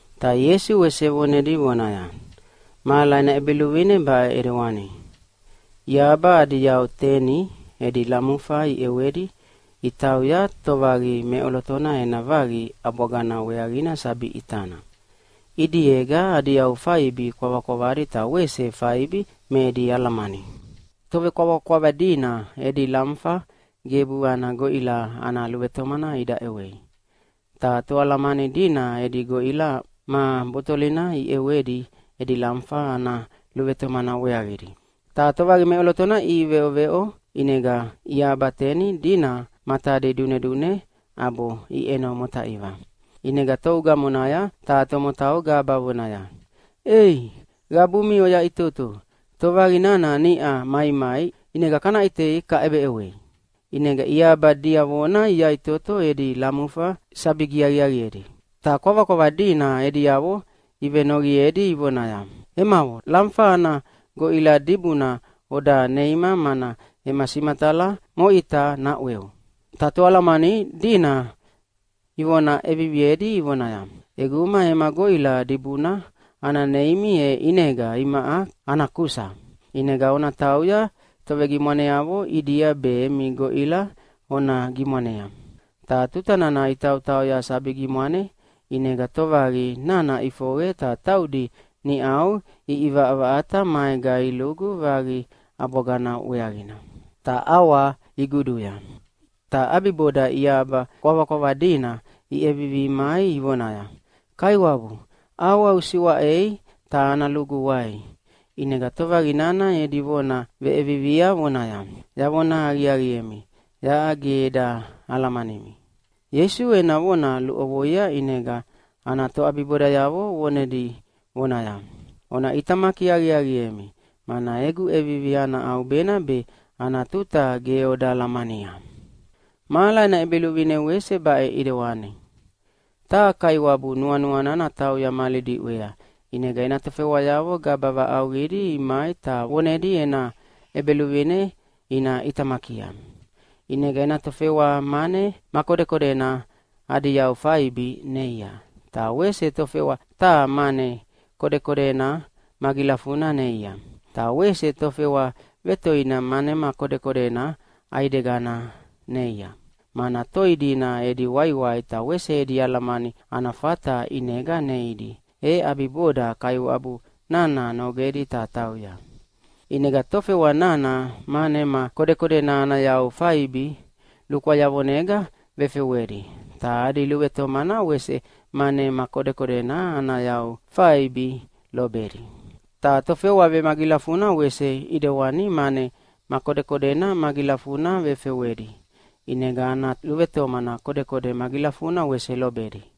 Ta Ieisu wese vonedi vonaya, “Mahala ena ʼEbeluvine baʼe ʼidewana: Iahaba adi yau teni edi lamufa iʼewedi itauya tovaqi meʼolotona ena vaqi ʼabwagana weaqina sabi ʼitana. ʼIdiega adi yau faibi kwavakwavadi ta wese faibi me edi alamani. Tovekwavakwava dina edi lamufa gebu ana goʼila ana luvetomana ida ʼewei. Ta toalamani dina edi goʼila ma botolina iʼewedi edi lamufa ana luvetomana weaqidi. Ta tovaqi meʼolotona iʼiveʼoveʼo, ʼinega iahaba teni dina matadi dunedune ʼabo iʼeno motaiva. “ʼInega tou gamonaya taha tomotau gaba vonaya, ‘Ei qabumi oyaʼitoto, tovaqi nana niʼa maimai ʼinega kaʼitei kaʼebeʼewei!’ ʼInega iahaba diavona iyaʼitoto edi lamufa sabi giaqiaqiedi. “Ta kwavakwava dina ediavo ivenoqiedi ivonaya, ‘Emavo, lamufa ana goʼila dibuna oda neima mana ema simatala moʼita naʼweu.’ “Ta toalamani dina ivona ʼeviviedi ivonaya, ‘ʼEguma ema goʼila dibuna ana neimi e ʼinega imaʼa ana kusa, ʼinega ona tauya tovegimwaneavo ʼidia be emi goʼila ona gimwanea.’ Ta tuta nana itautauya sabi gimwane, ʼinega tovaqi nana ʼifoqe ta taudi niʼau iʼivaʼavaʼata maega ilugu vaqi ʼabwagana weaqina. Ta ʼawa iguduya. “Ta ʼabiboda iahaba kwavakwava dina iʼevivi imai ivonaya, ‘Kaiwabu, ʼawa usiwaʼei ta ana lugu wai.’ “ʼInega tovaqi nana edi vona veʼevivia vonaya, ‘Yavona aqiaqiemi, yaʼa ge eda alamanimi.’” Ieisu ena vona luʼovoia ʼinega ana toʼabibodayavo vonedi vonaya, “Ona ʼitamaki aqiaqiemi, mana egu ʼevivi ana ʼaubena be ana tuta ge oda alamania. “Mahala ena ʼEbeluvine wese baʼe ʼidewani. Taha kaiwabu nuanuana natauya mali diʼwea, ʼinega ena tofewayavo gaba vaʼauqidi imai ta vonedi ena ʼebeluvine ina ʼitamakia. ʼInega ena tofewa mane ma kodekodena adi yau faibi neia, ta wese tofewa taha mane ma kodekodena magilafuna neia, ta wese tofewa vetoina mane ma kodekodena ʼaigedana neia, mana toi dina edi waiwai ta wese edi alamani ana fata ʼinega neidi, e ʼabiboda kaiwabu nana nogedi ta tauya. “ʼInega tofewa nana mane ma kodekodena ana yau faibi lukwayavonega vefewedi, ta adi luvetomana wese mane ma kodekodena ana yau faibi lobedi. Ta tofewa vemagilafuna wese ʼidewani mane ma kodekodena magilafuna vefewedi, ʼinega ana luvetomana kodekode magilafuna wese lobedi.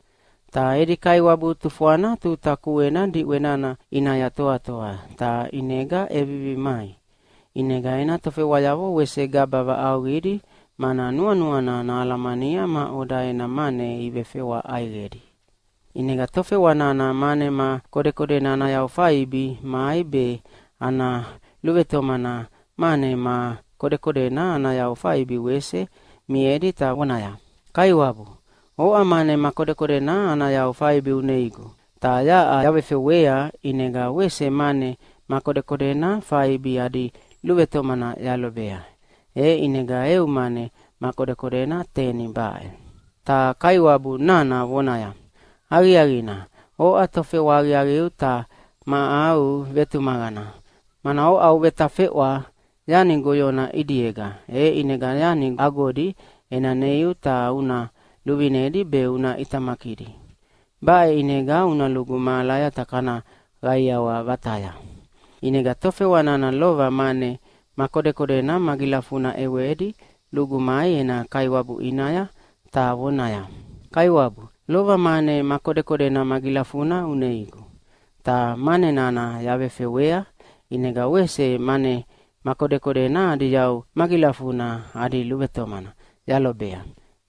“Ta edi kaiwabu tufwana tuta kuena diʼwe nana ʼinaya toatoa, ta ʼinega ʼevivi mai. ʼInega ena tofewayavo wese gaba vaʼauqidi mana nuanuana nahalamania maʼoda ena mane ivefewa ʼaiqedi. ʼInega tofewa nana mane ma kodekodena ana yau faibi mai be ana luvetomana mane ma kodekodena ana yau faibi wese miedi ta vonaya, ‘Kaiwabu, oʼa mane ma kodekodena ana yau faibi uneigu, ta yaʼa yavefewea ʼinega wese mane ma kodekodena faibi adi luvetomana yalobea, e ʼinega eu mane ma kodekodena teni baʼe.’ “Ta kaiwabu nana vonaya, ‘Aqiaqina, oʼa tofewa aqiaqiu ta ma au vetumaqana, mana oʼa uvetafewa yani goyona ʼidiega, e ʼinega yani agodi ena neiu ta una luvinedi be una ʼitamakidi. Baʼe ʼinega una lugu mahalaya ta kana qaiawa vataya.’ “ʼInega tofewa nana lova mane ma kodekodena magilafuna ʼewedi lugu mai ena kaiwabu ʼinaya, ta vonaya, ‘Kaiwabu, lova mane ma kodekodena magilafuna uneigu, ta mane nana yavefewea, ʼinega wese mane ma kodekodena adi yau magilafuna adi luvetomana yalobea,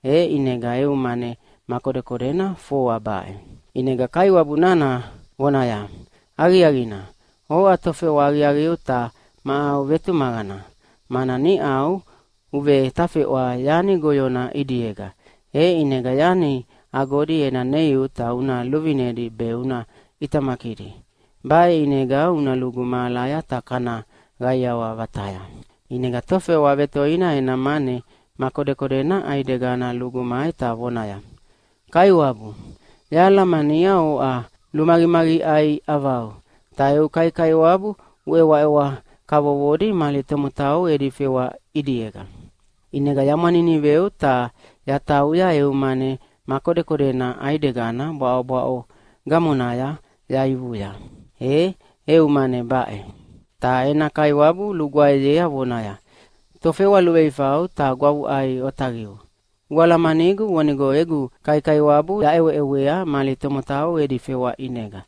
e ʼinega eu mane ma kodekodena foa baʼe.’ “ʼInega kaiwabu nana vonaya, ‘Aqiaqina, oʼa tofewa aqiaqiu ta ma au vetumaqana, mana niʼau uvetafewa yani goyona ʼidiega, e ʼinega yani agodi ena neiu ta una luvinedi be una ʼitamakidi. Baʼe ʼinega una lugu mahalaya ta kana qaiawa vataya.’ “ʼInega tofewa vetoina ena mane ma kodekodena ʼaidegina lugu mai ta vonaya, ‘Kaiwabu, yahalamania oʼa lumaqimaqiʼai ʼavau, ta eu kaikaiwabu uʼewaʼewa kavovodi mali tomotau edi fewa ʼidiega. ʼInega yamwaniniveu ta yatauya eu mane ma kodekodena ʼaidegina bwaʼobwaʼo gamonaya yaivuya, e eu mane baʼe.’ “Ta ena kaiwabu lugwaeyea vonaya, ‘Tofewa luveifau ta gwavuʼai otaqiu, ualamanigu vonigo egu kaikaiwabu yaʼeweʼewea mali tomotau edi fewa ʼinega.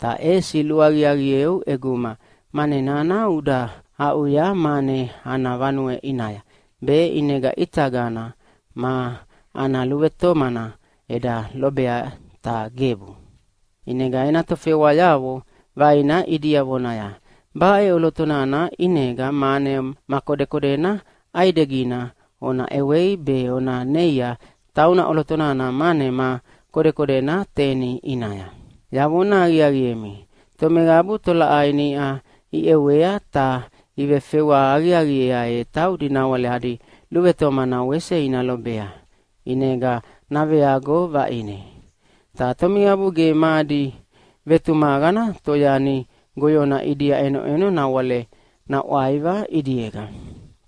Ta ʼesi luaqiaqieu ʼeguma mane nana uda aʼuya mane ana vanue ʼinaya, be ʼinega ʼitagana ma ana luvetomana eda lobea, ta gebu.’ “ʼInega ena tofewayavo vaina ʼidia vonaya, ‘Baʼe ʼolotona ʼinega mane ma kodekodena ʼaidegina ona ʼewei be ona neia tauna ʼoloto nana mane ma kodekodena teni ʼinaya.’ “Yavona aqiaqiemi, tomeqabu tolaʼai niʼa iʼewea ta ivefewa aqiaqiea, e taudi nawale adi luvetomana wese ina lobea, ʼinega naveago vaʼine. Ta tomeqabu ge ma adi vetumaqana toyani goyona ʼidia ʼenoʼeno nawale naʼwaiva ʼidiega.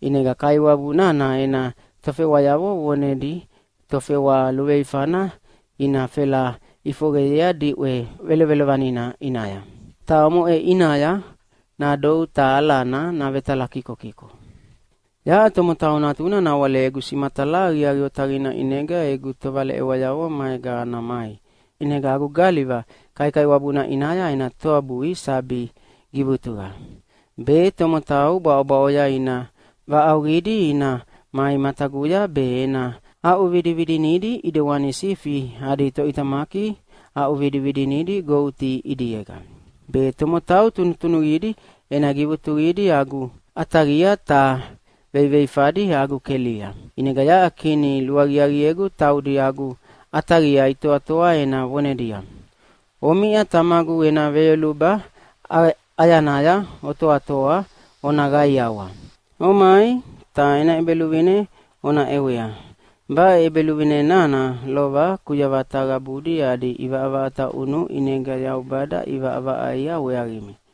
ʼInega kaiwabu nana ena tofewayavo vonedi tofewa luveifana ina fela ʼifoqeyea diʼwe velovelovanina ʼinaya. Ta omoʼe ʼinaya nadou ta alana navetalakikokiko. “Yaʼa Tomotau Natuna nawale egu simatala aqiaqi otaqina ʼinega egu tovaleʼewayavo maega ana mai, be ʼinega agu galiva kaikaiwabuna ʼinaya ena toabui sabi givutuqa. Be tomotau bwaʼobwaʼoya ina vaʼauqidi ina mai mataguya be ena aʼuvidividinidi ʼidewani sifi adi toʼitamaki aʼuvidividinidi goti ʼidiega. Be tomotau tunutunuqidi ena givutuqidi agu ʼataqia ta veiveifadi agu kelia. “ʼInega yaʼa Kini luaqiaqiegu taudi agu ʼataqia itoatoa ena vonedia, ‘Omiʼa Tamagu ena veyoluba ʼayanaya otoatoa ona qaiawa. Omai, ta ena ʼEbeluvine ona ʼewea. Baʼe ʼEbeluvine nana lova kuyavata qabudi adi ʼivaʼavaʼata ʼunu ʼinega Yaubada ʼivaʼavaʼaia weaqimi.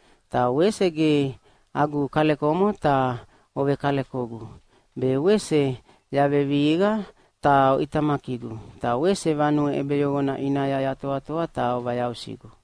Ta wese ge agu kalekomo ta ovekalekogu, be wese yavevihiqa ta oʼitamakigu, ta wese vanue ʼebeyoqona ʼinaya yatoatoa ta ovayausigu.’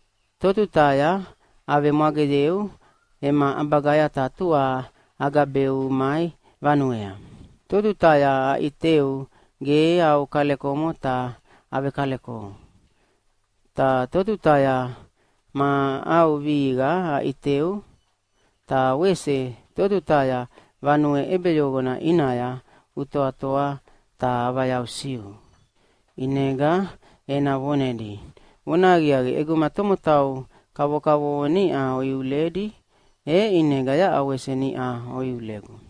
Totutaya avemwageyeu ema ʼabagaya ta tua agabeu umai vanuea? Totutaya aʼiteu ge au kalekomo ta avekalekou? Ta totutaya ma au vihiqa aʼiteu? Ta wese totutaya vanue ʼebeyoqona ʼinaya utoatoa ta avayausiu?’ “ʼInega ena vonedi, ‘Vonahaqiaqi, ʼeguma tomotau kavokavovo niʼa oiuledi, e ʼinega yaʼa wese niʼau oiulegu.’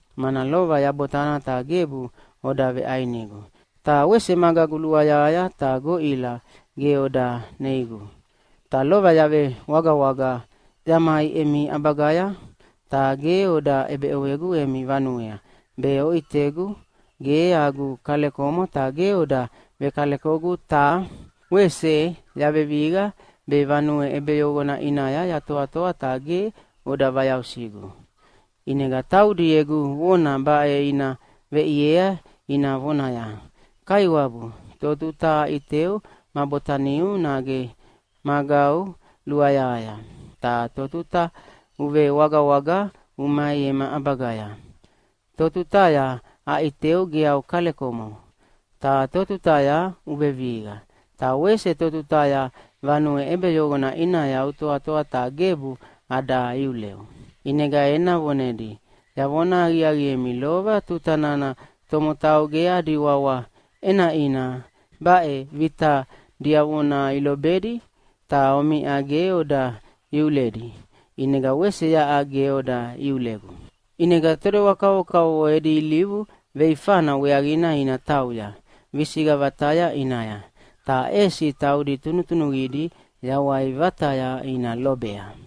Mana lova yabotana ta gebu oda veʼainigu, ta wese magagu luayahaya ta goʼila ge oda neigu. Ta lova yavewagawaga yamai emi ʼabagaya ta ge oda ʼebeʼewegu emi vanuea, be oʼitegu ge agu kalekomo ta ge oda vekalekogu, ta wese yavevihiqa be vanue ʼebeyoqona ʼinaya yatoatoa ta ge oda vayausigu.’ “ʼInega taudi egu vona baʼe ina veʼiei ina vonaya, ‘Kaiwabu, totuta aʼiteu ma botaniu nage magau luayahaya? Ta totutaya uvewagawaga umai ema ʼabagaya? Totutaya aʼiteu ge au kalekomo? Ta totutaya uvevihiqa? Ta wese totutaya vanue ʼebeyoqona ʼinaya utoatoa ta gebu ada iuleu?’ “ʼInega ena vonedi, ‘Yavona aqiaqiemi, lova tuta nana tomotau ge adi wawa ʼenaʼina baʼe vita diavona ilobedi ta omiʼa ge oda iuledi, ʼinega wese yaʼa ge oda iulegu.’ ʼInega todewa kavokavovo edi ilivu veifana weaqina ina tauya visiqa vataya ʼinaya, ta ʼesi taudi tunutunuqidi yawai vataya ina lobea.”